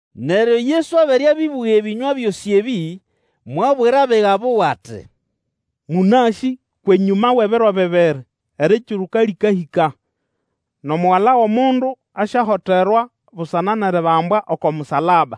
Neryo Yesu abere abĩbũga ebĩnywa byosĩ ebĩ, mwabwira abiga buwe ati. Mũnasĩ enyũma wʼebiro bibiri Erikiruka lĩkahĩka, nʼomugala wʼomundu asyahoterwa busana nʼeribambwa oko musalaba.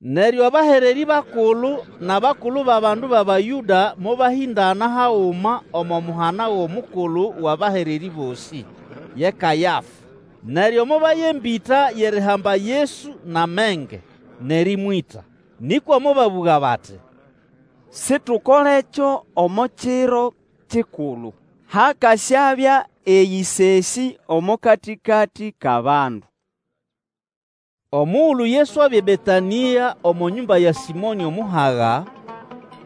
Neryo abahererĩ bakulu nʼabakulu bʼabandu bʼAbayũda mobahĩndana haguma omo muhana gʼomukulu wʼabahererĩ bosĩ, ye Kayafa. Neryo mobaya embĩta yʼerihamba Yesu nʼamenge, nʼerĩmwĩta. Nĩkwa mobabũga bati, situkolekyo omo kiro kikulu, hakasyabya eyĩsesĩ omo katĩkatĩ kʼabandu. Omugulu Yesu abya eBetanĩa omo nyũmba ya Sĩmonĩ omuhaga,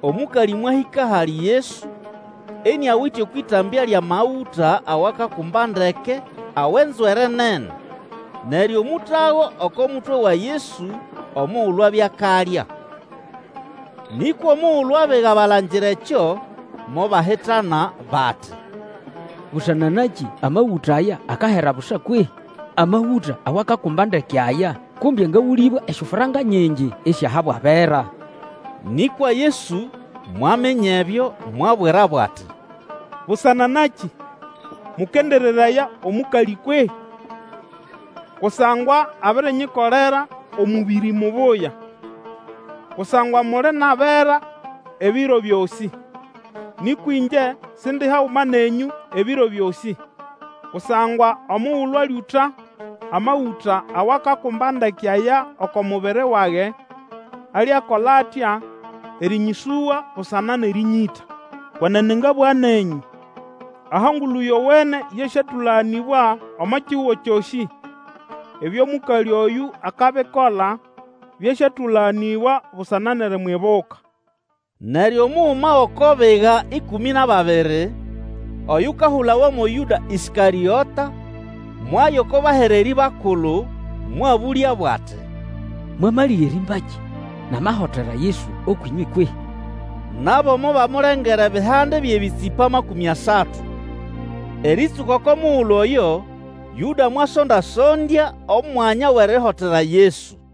omũkalĩ mwahĩka ahali Yesu, iniawite okwʼĩtambya lyʼamagũta awakakumba ndeke awʼenzwere nene, neryo mũtago oko mutwe wa Yesu omugulu abya akalya. Nĩkwa omugulu abiga balangira ekyo, mobahitana bati, Busana nakĩ amagũta aya akahera busa kwehĩ? Amagũta awakakumba ndeke aya kumbe angagũlĩbwe esyofranka nyingi isyahabwa abera. Nĩkwa Yesu, mwaminya ebyo, mwabwirabo ati, Busana nakĩ mũkendereraya omũkalĩ kwehĩ? Kusangwa abirinyikolera omũbĩrĩ mubuya. Kusangwa muli nʼabera ebiro byosĩ, nĩkwa ĩngye Sindi haguma nenyũ ebiro byosĩ. Kusangwa omugulu alyũta amagũta awakakumba ndeke aya oko mubiri wage, alyakola atya erinyĩsũga busana nʼerinyita. Kwenene ngabũga nenyũ, Aho Engulu Yowene yasyatũlaganĩbwa omo kihugo kyosĩ, ebyo mũkalĩ oyũ akabikola byasyatũlaganĩbwa busana nʼerimwibuka. Neryo omuguma wʼoko biga ĩkũmĩ nʼababiri, oyukahulawa mo Yũda Ĩskarĩota, mwaya oko bahererĩ bakulu, mwabũlyabo ati, Mwamalĩga erimbakĩ namahotera Yesu ũkwʼĩnywe kwehĩ? Nabo mobamulengera ebihande byʼebĩtsĩpa makũmĩ asatu. Erĩtsũka oko mugulu oyo, Yũda mwasonda-sondya omwanya wʼerihotera Yesu.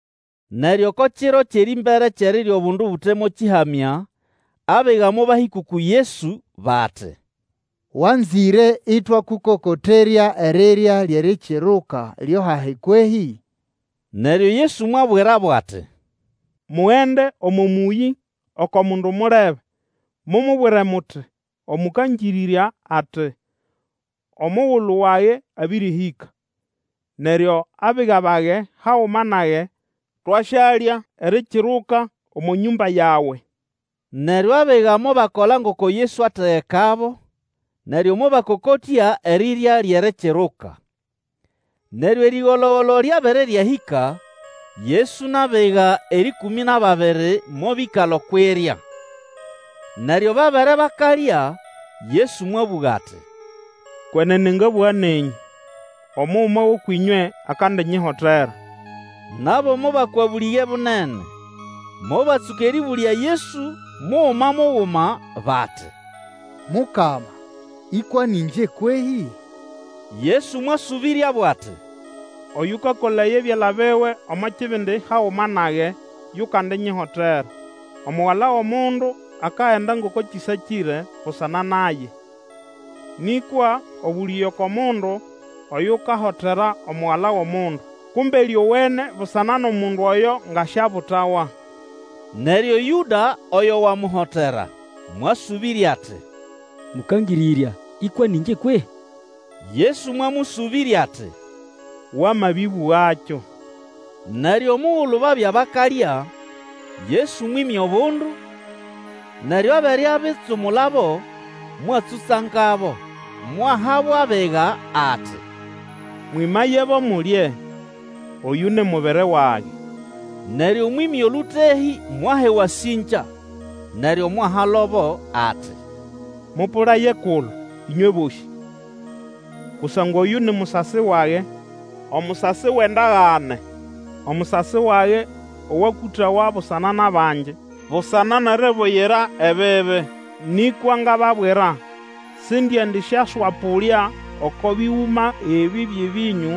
Neryo oko kiro kyʼerĩmbere kyʼerirya obundu Bute mo Kĩhamya, abiga mobahĩka uku Yesu, bati, Wanzĩre ĩtwakũkokoterya erirya lyʼErikiruka lyo hahi kwehĩ? Neryo Yesu mwabwirabo ati, Mugende omo mũyĩ, oko mundu mulebe, mumubwire muti, Omũkangĩrĩrya ati, Omugulu wage abĩrĩhĩka, neryo abiga bage haguma nage twasyalya Erikiruka omo nyũmba yawe. Neryo abiga mobakola ngoko Yesu ategekabo, neryo mobakokotya erirya lyʼErikiruka. Neryo erĩgolo-golo lyabere ryahĩka, Yesu nʼabiga erĩkũmĩ nʼababiri mobĩkala okwʼirya. Neryo babere bakalya, Yesu mwabũga ati, Kwenene ngabũga nenyũ, omuguma wʼũkwʼĩnywe akandinyihotera. Nabo mobakwa bũlĩge bunene, mobatsũka erĩbũlya Yesu muguma muguma, bati, Mukama ĩkwa nĩ ĩngye kwehĩ? Yesu mwasũbĩryabo ati, Oyũkakolaya ebyala biwe omo kibindi haguma nage yukandinyihotera. Omugala wʼomundu akagenda ngoko kĩsakĩre busana naye, nĩkwa obũlĩge oko mundu oyukahotera Omugala wʼomundu! Kumbe lyowene busana nʼomundu oyo nga siabutawa! Neryo Yũda, oyo wamuhotera, mwasũbĩrya ati, Mũkangĩrĩrya, ĩkwa nĩ ngye kwehĩ? Yesu mwamũsũbĩrya ati, Wamabĩbugakyo. Neryo omugulu babya bakalya, Yesu mwĩmya obundu, neryo abere abitsumulabo, mwatsũtsangabo, mwahabo abiga ati, Mwĩmayebo, mulye; oyũ ni mubiri wage. Neryo mwĩmya olũtehĩ mwaha ewasĩngya, neryo mwahalobo ati, Mũpũlaye kulo, ĩnywe bosĩ. Kusangwa oyũ ni musasi wage, omusasi wʼendagane, omusasi wage owakũtawa busana nʼabangi, busana nʼeribuyira ebibi. Nĩkwa ngababwira, sindiendisyaswapũlya oko bĩgũma ebĩ byʼebĩnyũ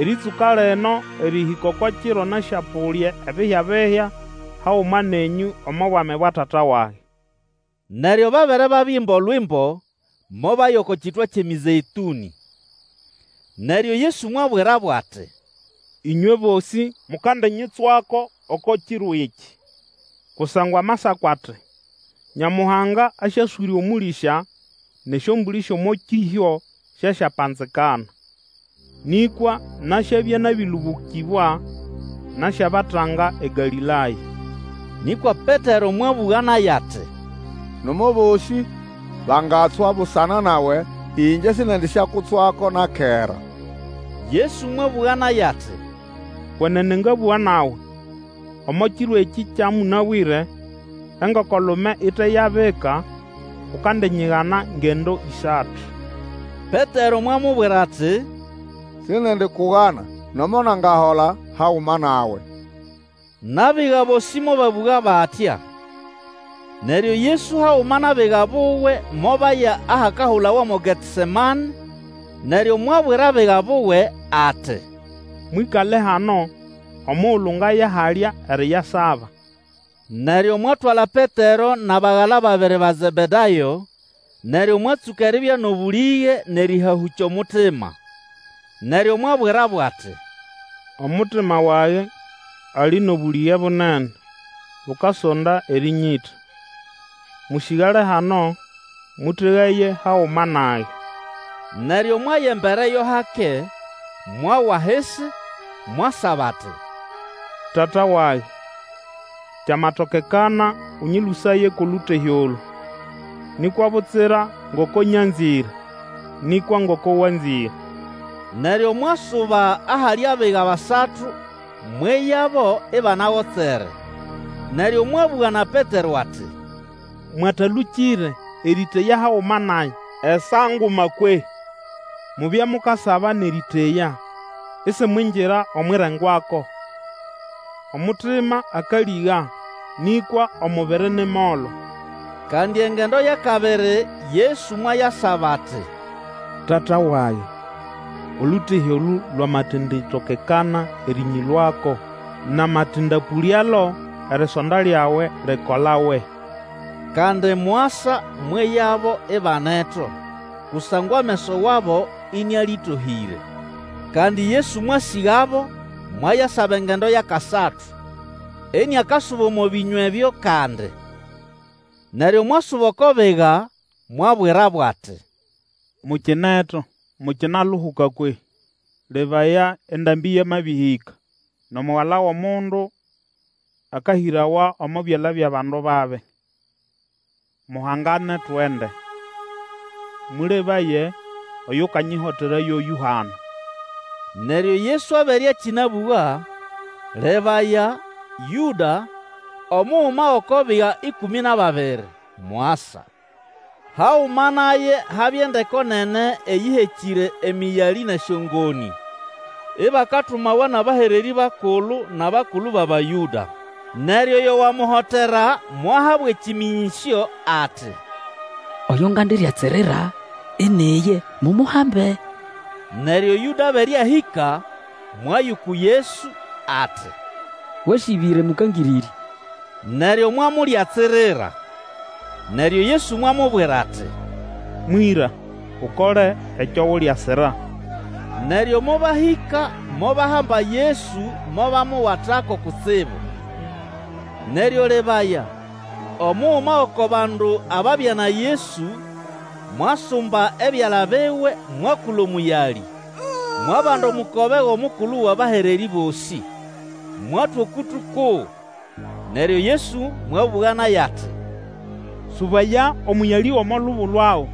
erĩtsũka lino erĩhĩka oko kiro nasyapũlya ebihyabihya haguma nenyũ omo bwami bwa Tata wage. Neryo babere babiimba Olwimbo, mobaya oko kitwa kyʼeMĩzeĩtũnĩ. Neryo Yesu mwabwirabo ati, Ĩnywe bosĩ mukandinyitswako oko kiro ekĩ, kusangwa amasako ati, Nyamuhanga asyaswĩrya omũlĩsya, nʼesyombũlĩ syʼomo kĩhyo syasyapanzikana. Nĩkwa nasyabya nabĩlũbũkĩbwa, nasyabatanga eGalĩlaya. Nĩkwa Petero mwabũga naye ati, Nomo abosĩ bangatswa busana nawe, ĩngye sindiendisyakutswako na kera. Yesu mwabũga naye ati, Kwenene ngabũga nawe, omo kiro ekĩ kya mũnabwĩre, engoko-lume ite yabika, ukandinyigana ngendo ĩsatu. Petero mwamubwira ati, Sindiendikugana, nomo nangahola haguma nawe. Nʼabiga bosĩ mobabũga batya. Neryo Yesu haguma nʼabiga buwe mobaya ahakahulawa mo Getesemane, neryo mwabwira abiga buwe ati, Mwĩkale hano omugulu ngaya halya eriyasaba. Neryo mwatwala Petero nʼabagala babiri ba Zebedayo, neryo mwatsũka eribya nʼobũlĩge nʼerĩhahũkya omutima. Neryo mwabwirabo ati, Omutima wage ali nʼobũlĩge bunene bukasonda erĩnyĩta. Mũsĩgale hano, mũtegaye haguma nage. Neryo mwaya embere yo hake, mwawa ahisi, mwasaba ati, Tata wage, kyamatokekana, Ũnyĩlũsaye kwʼolũtehĩ olũ! Nĩkwa butsira ngoko nyazĩre, nĩkwa ngoko wanzĩre. Neryo mwasuba ahali abiga basatu mweyabo ibanagotsere, neryo mwabũga na Petero ati, Mwatalũkĩre erĩteya haguma nage esaa nguma kwehĩ? Mubye mukasaba nʼerĩteya, isimwingira omwʼirengwako; omutima akalĩga, nĩkwa omubiri ni molo. Kandi engendo yʼakabiri Yesu mwayasaba ati, Tata wage, olũtehĩ olũ lwamatenditokekana erĩnyĩlũako namatindapũlyalo, erisonda lyawe likolawe. Kandi mwasa mweyabo ibaneto, kusangwa ameso wabo ĩnĩalĩtohĩre. Kandi Yesu mwasĩgabo, mwayasaba engendo yʼakasatu, iniakasuba omo bĩnywa ebyo kandi. Neryo mwasuba oko biga, mwabwirabo ati, Mukineto, mukinauhuka kwehĩ? Lebaya! Endambĩ yamahĩka, nʼomugala wʼomundu akahĩrawa omo byala byʼabandu babi. Muhangane, tugende! Mũlebaye, oyukanyihotera yoyũ hano! Neryo Yesu abere akĩnabũga, lebaya, Yũda, omuguma wʼoko biga ĩkũmĩ nʼababiri, mwasa. Haguma naye habya endeko nene eyĩhekĩre emĩyalĩ nʼesyongonĩ, ibakatumawa nʼabahererĩ bakulu nʼabakulu bʼAbayũda. Neryo oyo wamuhotera mwahabo ekĩmĩnyĩsyo ati, Oyo ngandilyatsirira, ini iye; mumuhambe! Neryo Yũda abere ahĩka, mwaya uku Yesu ati, Wasĩbĩre, Mũkangĩrĩrya! neryo mwamulyatsirira. Neryo Yesu mwamubwira ati, Mwĩra, Ukole ekyo uliasira! Neryo mobahĩka mobahamba Yesu mobamuwatako kutsibu. Neryo lebaya, omuguma wʼoko bandu ababya na Yesu mwasumba ebyala biwe mwakula omũyali, mwabanda omukobe wʼomukulu wʼabahererĩ bosĩ, mwatwa okũtũ kuwe. Neryo Yesu mwabũga naye ati, Sũbaya omũyalĩ gʼomo lubo lwago;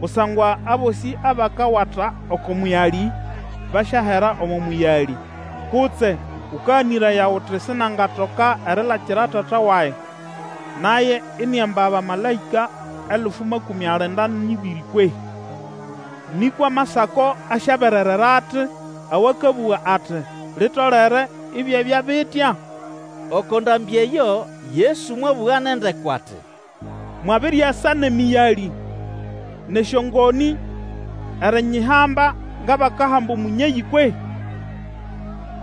kusangwa abosĩ abakawata oko mũyalĩ, basyahera omo mũyalĩ. Kutse Ũkaganĩraya uti sinangatoka erilakira Tata wage, naye iniamba abamalaĩka elfu makũmĩ alinda nʼĩbĩrĩ kwehĩ? Nĩkwa Amasako asyabererera ati awakabuga ati, Litolere ibyabya bitya? Oko ndambĩ eyo Yesu mwabũga nʼendeko ati, Mwabiriasa nʼemĩyalĩ nʼesyongoni erinyihamba ngʼabakahamba omũnyeyĩ kwehĩ?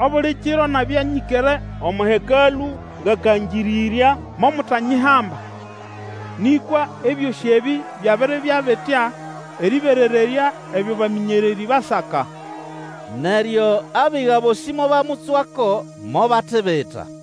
Obuli kiro nabya nyĩkere omo Hekalũ ngakangĩrĩrya, momutanyihamba. Nĩkwa ebyosĩ ebĩ byabiribya bitya erĩberererya ebyo bamĩnyererĩ basaka. Neryo abiga bosĩ mobamutswako, mobatibita.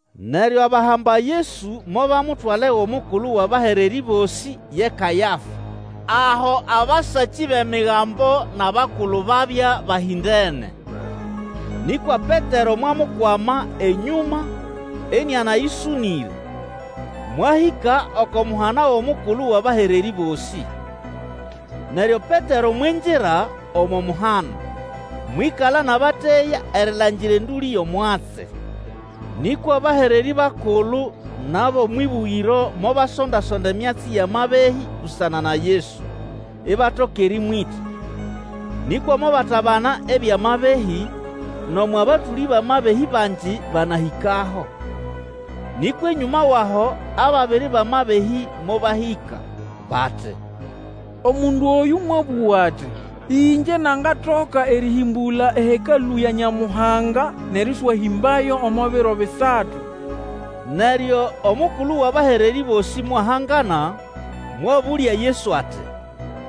Neryo abahamba Yesu mobamutwala ewʼomukulu wʼabahererĩ bosĩ ye Kayafa, aho abasakĩ bʼEmigambo nʼabakulu babya bahĩndene. Nĩkwa Petero mwamukwama enyũma inianayĩsũnĩre, mwahĩka oko muhana gʼomukulu wʼabahererĩ bosĩ. Neryo Petero mwingira omo muhana, mwĩkala nʼabateya erilangira endũlĩ yʼomwatsi. Nĩkwa abahererĩ bakulu nʼabʼomwʼĩbũgĩro mobasonda-sonda emyatsi yʼamabehĩ busana na Yesu, ibatoka erĩmwĩta. Nĩkwa mobatabana ebyʼamabehĩ, nomo abatũlĩ bʼamabehĩ bangi banahĩkaho. Nĩkwa enyũma wʼaho ababiri bʼamabehĩ mobahĩka, bati, Omundu oyũ mwabũga ati, Ĩngye nangatoka erĩhĩmbũla eHekalũ ya Nyamuhanga, nʼerĩswahĩmbayo omo biro bisatu. Neryo omukulu wʼabahererĩ bosĩ mwahangana, mwabũlya Yesu ati,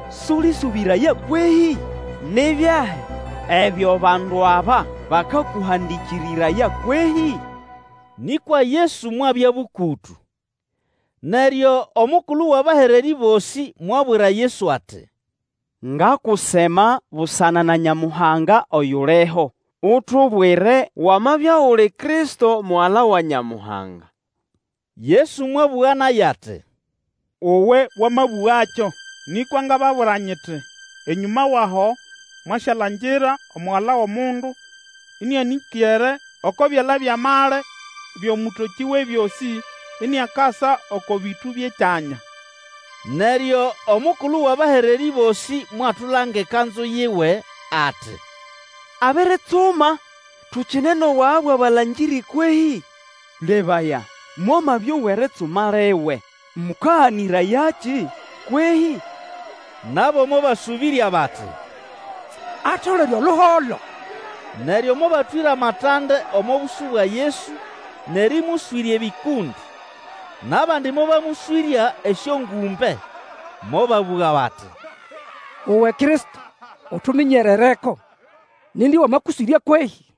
Sũlĩsũbĩraya kwehĩ? Ni byahi ebyo bandu aba bakakũhandĩkĩrĩraya kwehĩ? Nĩkwa Yesu mwabya bũkũtũ. Neryo omukulu wʼabahererĩ bosĩ mwabwira Yesu ati, Ngakusema busana na Nyamuhanga oyuliho, utubwire wamabya uli Kristo, Mugala wa Nyamuhanga. Yesu mwabũga naye ati, Uwe wamabũgakyo, nĩkwa ngababwira nyiti, Enyũma wʼaho mwasyalangira Omugala wʼomundu ĩnĩanĩkere oko byala byʼamali byʼOmũtokĩ Wʼebyosĩ, iniakasa oko bĩtũ byʼekyanya. Neryo omukulu wʼabahererĩ bosĩ mwatulanga ekanzu yiwe, ati, Abiritsuma! Tukine nʼobwaga bwʼabalangĩrĩ kwehĩ? Lebaya, mwamabyowa eritsuma liwe! Mũkaganĩrayakĩ kwehĩ? Nabo mobasũbĩrya bati, Atolere oluholo! Neryo mobatwĩra matande omo bũsũ bwa Yesu nʼerĩmũswĩrya ebĩkũndĩ, nʼabandi mobamũswĩrya esyongũmbe. Mobabũga bati, Uwe Kristo, utuminyerereko! Nindi wamakũswĩrya kwehĩ?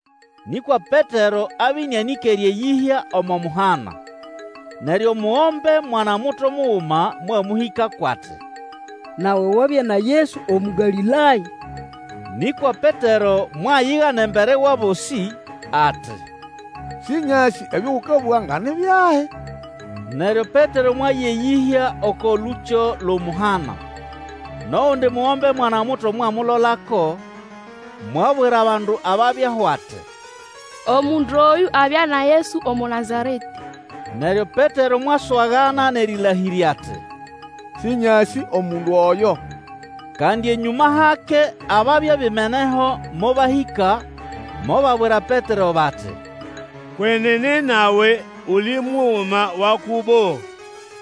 Nĩkwa Petero abya ĩnĩanĩkere eyĩhya omo muhana. Neryo omugombe mwana-muto muguma mwamũhĩkako ati, Nawe wabya na Yesu Omũgalĩlaya. Nĩkwa Petero mwayigana embere wʼabosĩ ati, Sĩnyasĩ ebyo ũkabũga nga ni byahi. Neryo Petero mwaya eyĩhya oko lũkyo lwʼomuhana, nʼogundi mugombe mwana-muto mwamulolako, mwabwira bandu ababyaho ati, Omundu oyũ abya na Yesu Omũnazaretĩ. Neryo Petero mwaswagana nʼerĩlahĩrya ati, Sĩnyasĩ omundu oyo. Kandi enyũma hake ababya bimeneho mobahĩka mobabwira Petero bati, Kwenene nawe uli muguma wa kubo,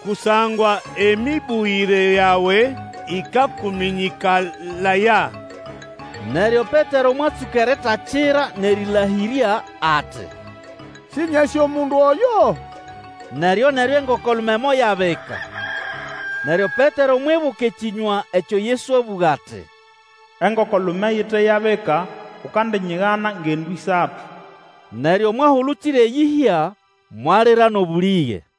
kusangwa emĩbũgĩre yawe ĩkakũmĩnyĩkalaya. Neryo Petero mwatsũka eritakira nʼerĩlahĩrya ati, Sĩnyasĩ omundu oyo! Neryo-neryo engoko-lume moyabika. Neryo Petero mwibuka ekĩnywa ekyo Yesu abũga ati, Engoko-lume ite yabika, ukandinyigana ngendo ĩsatu. Neryo mwahulukira eyĩhya, mwalira nʼobũlĩge.